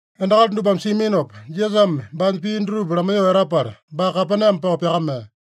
Endakali dupame siaminopa, Jisasame baanya pii dutupa lamaiyoo etapala, baa Kapename pao pyakamea.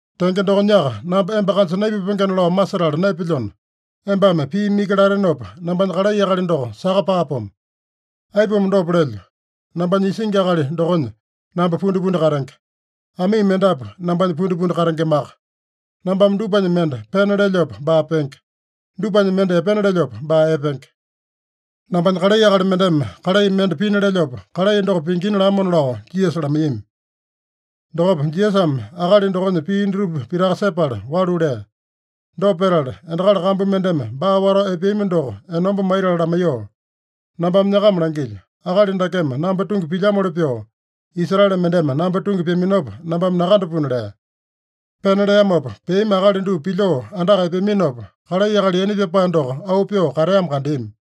Tenge dokonyaka, namba emba kanja naipupengena lao masetala naepelyona, embame piimi iki latenopa, nambanya kalai akali doko saka paapomo. Aipuma dopa lelyo? Nambanya isingi akali dokonya namba pundipundi katenge. Amii mendapu nambanya pundipundi katengemaka. Nambame dupanya mende pena lelyopa, baa penge. Dupanya mende epena lelyopa, baa epenge. Nambanya kalai akali mendeme kalai mende pina lelyopa, kalai doko pingina’ lamona” lao Jisasa lamaiyami. Dokopa Jisasame akali dokonya pii dutupa pitaka sepala walu lea. Dopa petala, endakali kambu mendeme baa watao epeami doko enomba maitala lamaiyoo, “Nambame nyakama langilyo: Akali dakeme namba tungi pilyamoli pyoo, Israele mendeme namba tungi pyaminopa nambame nakandapuna” lea. Pena leamopa peami akali dupa pilyoo andaka epeaminopa, kalai akali yaina pyapae doko auu pyoo kateamo kandeami.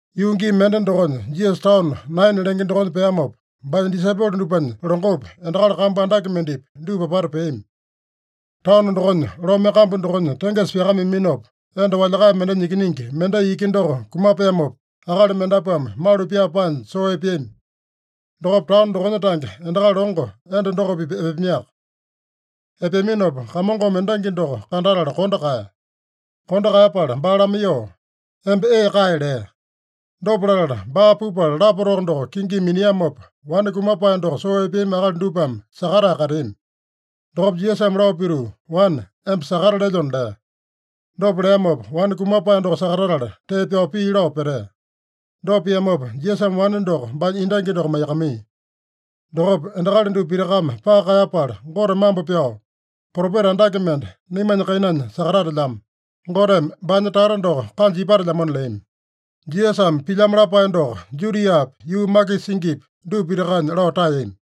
Yuu gii mende dokonya Jisasa taono Naina lenge dokonya peamopa, baanya disaipolo dupanya longopi, endakali kambu andake mendepi, dupa apata peami. Taono dokonya lome kambu dokonya tengesa pyakameaminopa, enda walyakae mendenya ikiningi mendai iki doko kumapeamopa, akali mendapuame malu pyaa paanya soo epeami. Dokopa taono dokonya tange endakali longo enda doko-pipa epeamiaka. Epeaminopa Kamongome endangi doko kandatala kondo kaeya. Kondo kaeyapala baa lamaiyoo, “Emba ee kae” lea. Dopa latala, baa pupala lapa-toko doko kingimi miniamopa, wane kumapae doko soo epeami akali dupame sakatae kateami. Dokopa Jisasame lao pituu, “Wane, emba sakata lelyona” lea. Dopa leamopa wane kumapae doko sakatatala, tee pyao pii lao petea. Dopa piamopa Jisasame wane doko baanya endangi doko maiyakamaiya. Dokopa endakali dupa pitakame paka kaeyapala, Gote mambo pyao, “Propeta andake mende naimanya kainanya sakatatelyamo! Goteme baanya tata doko kanja ipatelyamona” leami. Jisasame pilyamo lapae doko Judiapi, yuu makisa singipi, dupa pitakanya lao taeyami.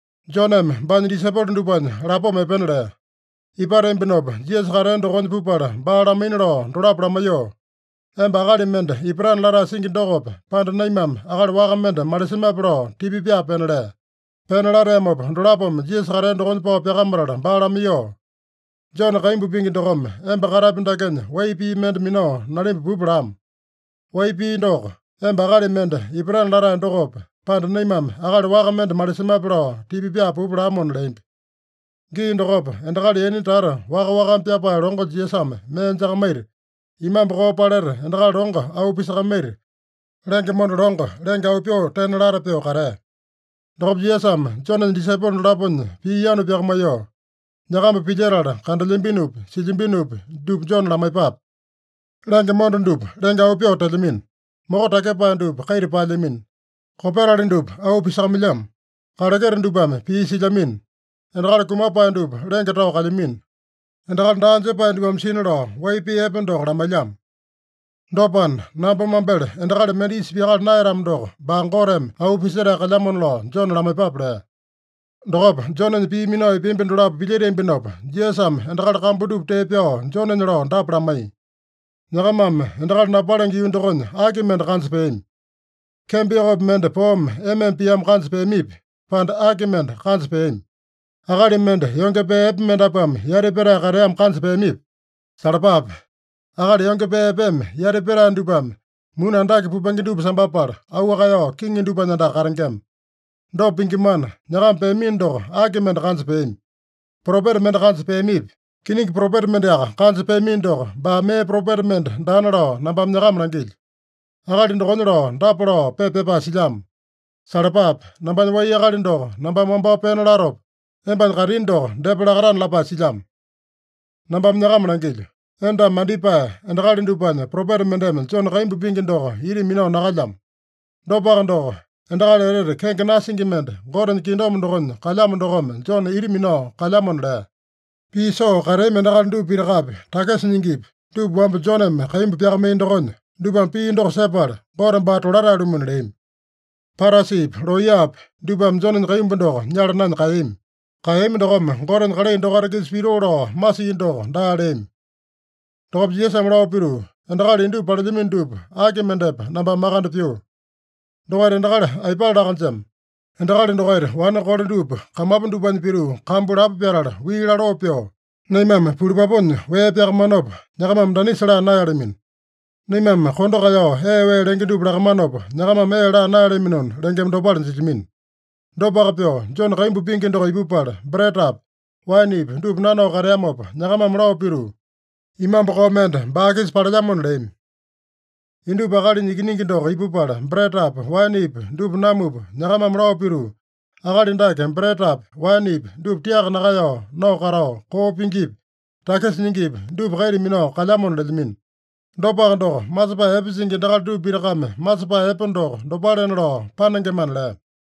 Joneme baanya disaipolo dupanya lapoma epena lea. Ipateambinopa, Jisasa katea dokonya pupala, baa lamaina lao dolapo lamaiyoo, “Emba akali mende ipatana latae singi dokope, pande naimame akali waka mende malisemape?” lao tipa pyaa pena lea. Pena lateamopa, dolapome Jisasa katea dokonya pao pyakamatala baa lamaiyoo, “Jone kaimbu pingi dokome emba katapi dakenya wai pii mende minao nalimba pupa lamo. Wai pii doko, ‘Emba akali mende ipatana latae dokope, pande naimame akali waka mende malisemape’ lao tipa pyaa pupa lamona” leambi. Gii dokopa endakali yaina tata waka-wakame pyapae longo Jisasame mee jakamaita, imambu koo paleta endakali longo auu pisakamaita, lenge monda longo lenge auu pyoo tena lata pyoo katea. Dokopa Jisasame Jonenya disaipolo dolaponya pii yanu pyakamaiyoo, “Nyakamba pilyetala, kandelyambinopi, silyambinopi dupa Jone lamaiyepape. Lenge monda dupa lenge auu pyoo telyamino. Moko takyepae dupa kaita paelyamino. Kopetali dupa auu pisakamailyamo. Kaleketa dupame pii silyamino. Endakali kumapae dupa lenge tao kalyamino. Endakali daa jepae dupame sina lao wai pii epe doko lamailyamo. Dopana, namba mambele endakali mende isa pyakala naeyatamo doko, baa Goteme auu pisetae kalyamona lao Jone lamaiyepape” lea. Dokopa Jonenya pii minao epeambi dolapo pilyeteambinopa, Jisasame endakali kambu dupa tee pyao Jonenya lao dapa lamaiya: “Nyakamame endakali napalenge yuu dokonya aki mende kanja peami? Kembo yokopi mende poome ema-ema piamo kanja peamipi, pande aki mende kanja peami? Akali mende yonge pee epe mendapuame yati petae kateamo kanja peamipi? Salapape! Akali yonge pee epeme yati petae dupame, muni andake pupenge dupa sambapala, auu kaeyao kiŋi dupanya andaka katengema. Dopa pingimana, nyakama peamino doko aki mende kanja peami? Propeta mende kanja peamipi? Kiningi propeta mendeaka kanja peamino doko, baa mee propeta mende daana lao nambame nyakama langilyo. Akali dokonya lao dapa lao pepa pyapae silyamo: ‘Salapape! Nambanya wai akali doko nambame wambao pena latopa, embanya kaitini doko depa lakatana’ lapae silyamo. Nambame nyakama langilyo: Endame mandipae endakali dupanya propeta mendeme Jone kaimbu pingi doko ita minao nakalyamo. Dopaka doko, endakali etete kenge nasingi mende, Gotenya kingdom dokonya kalyamo dokome Jone ita minao kalyamona” lea. (Pii soo kateami endakali dupa pitakapi, takisa nyingipi, dupa wamba Joneme kaimbu pyakamaiya dokonya, dupame pii doko sepala, Gote baa tolatae-lumuna leami. Parasipi, looyapi dupame Jonenya kaimbu doko nyala naenya kaeyami. Kaeyami dokome, Gotenya kalai dokaita-kisa pitoo lao masia doko daa leami.) Dokopa Jisasame lao pituu, “Endakali indupa palelyamino dupa, aki mendepa nambame makande pyuu? Dokaita endakali aipale laa-kanjema? Endakali dokaita wane kole dupa kamapu dupanya pituu kambu lapo pyatala, wii laloo pyoo, ‘Naimame pulupapunya wee pyakamanopa, nyakamame danisa laa naeyalamino. Naimame kondo kaeyao ee wee lenge dupa lakamanopa, nyakamame ee laa naeyalaminona’ lengema dopale jilyamino. Dopaka pyoo, Jone kaimbu pingi doko ipupala, bretapi, waenepi dupa nanao kateamopa, nyakamame lao pituu, ‘Imambu koo mende baa-kisa palelyamona’ leami. Indupa Akalinya Ikiningi doko ipupala bretapi, waenepi dupa namupa, nyakamame lao pituu, ‘Akali dake bretapi, waenepi dupa tiaka nakaeyao nao katao, koo pingipi, takisa nyingipi dupa kaita minao kalyamona’ lelyamino. Dopaka doko, masepae epe singi endakali dupa pitakame masepae epe doko dopalena lao panengemana” lea.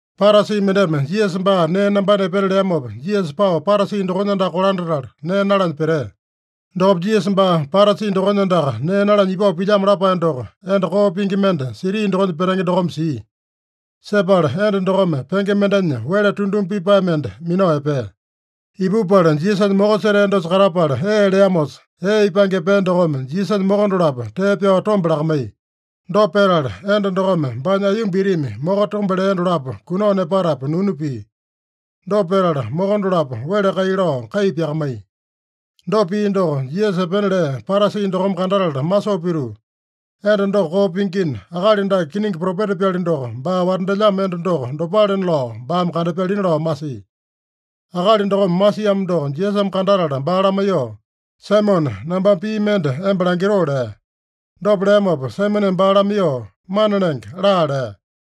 Parasi mendeme Jisasa baa nee nambana epena leamopa, Jisasa pao Parasi dokonya andaka kolandatala nee nalanya petea. Dokopa Jisasa baa Parasi dokonya andaka nee nalanya ipao pilyamo lapae doko enda koo pingi mende siti dokonya petenge dokome sia. Sepala enda dokome penge mendenya wele tunduma pipae mende minao epea. Ipupala Jisasanya moko setea dosa katapala ee leamosa, ee ipange epea dokome Jisasanya moko dolapo tee pyao tombe lakamaiya. Dopa petala, enda dokome baanya aiyomba itimi moko tombe lea dolapo kunao nepatapu nunu pia. Dopa petala, moko dolapo wele kai lao kai pyakamaiya. Dopa pia doko Jisasa epena lea Parasi dokome kandatala masoo pituu, “Enda doko koo pingina, akali dake kiningi propeta-pyali doko, baa watandelyamo enda doko dopalena lao baame kandapyalina” lao masia. Akali dokome masiamo doko Jisasame kandatala baa lamaiyoo, “Saimone, nambame pii mende emba langitoo” lea. Dopa leamopa Saimoneme baa lamaiyoo, “Mana Lenge, laa” lea.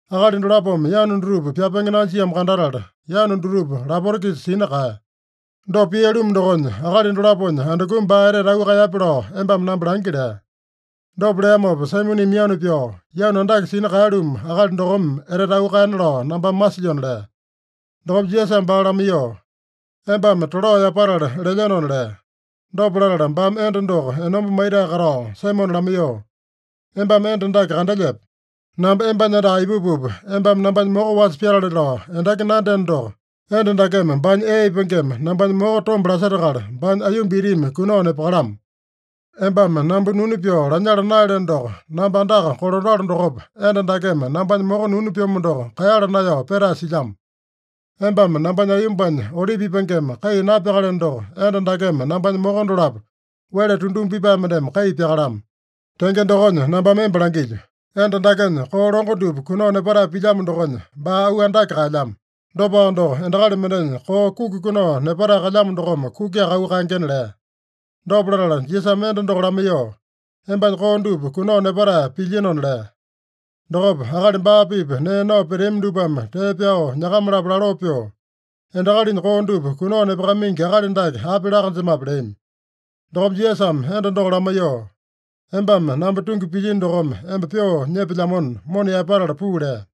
Akali dolapome yanu dutupa pyapenge nanjiamo kandatala, yanu dutupa lapota-kisa sina kaeya. Dopa pia-lumu dokonya, akali dolaponya andukumi baa etete auu kaeyape lao embame namba langi” lea. Dopa leamopa Saimoneme yanu pyao, “Yanu andake sina kaeya-lumu akali dokome etete auu kaeyana lao nambame masilyona” lea. Dokopa Jisasame baa lamaiyoo, “Embame tolao yapatala lelyenona” lea. Dopa latala baame enda doko enomba maitae katao Saimone lamaiyoo, “Embame enda dake kandelyepe? Namba embanya andaka ipupupa, embame nambanya moko wasa pyatale lao endaki nandyeno doko, enda dakeme baanya ee ipangeme nambanya moko tombe lasetakala, baanya aiyomba itimi kunao nepakalamo. Embame namba nunu pyoo lanyala naeyaleno doko, namba andaka kolandalo dokopa, enda dakeme nambanya moko nunu pyomo doko kaeyala naeyao petae silyamo. Embame nambanya aiyombanya olipi ipangeme kai napyakaleno doko, enda dakeme nambanya moko dolapo wele tunduma pipae mendeme kai pyakalamo. Tenge dokonya nambame emba langilyo: Enda dakenya koo longo dupa kunao nepatae pilyamo dokonya, baa auu andake kaelyamo. Dopaka doko, endakali mendenya koo kuki kunao nepatae kalyamo dokome kukiaka auu kaengena” lea. Dopa latala Jisasame enda doko lamaiyoo, “Embanya koo dupa kunao nepatae pilyenona” lea. Dokopa akali baa-pipa nee nao peteami dupame tee pyao nyakama-lapo laloo pyoo, “Endakalinya koo dupa kunao nepakamaingi akali dake api laa-kanjemape?” leami. Dokopa Jisasame enda doko lamaiyoo, “Embame namba tungi pilyino dokome emba pyoo nyepelyamona, mona yaepatala puu” lea.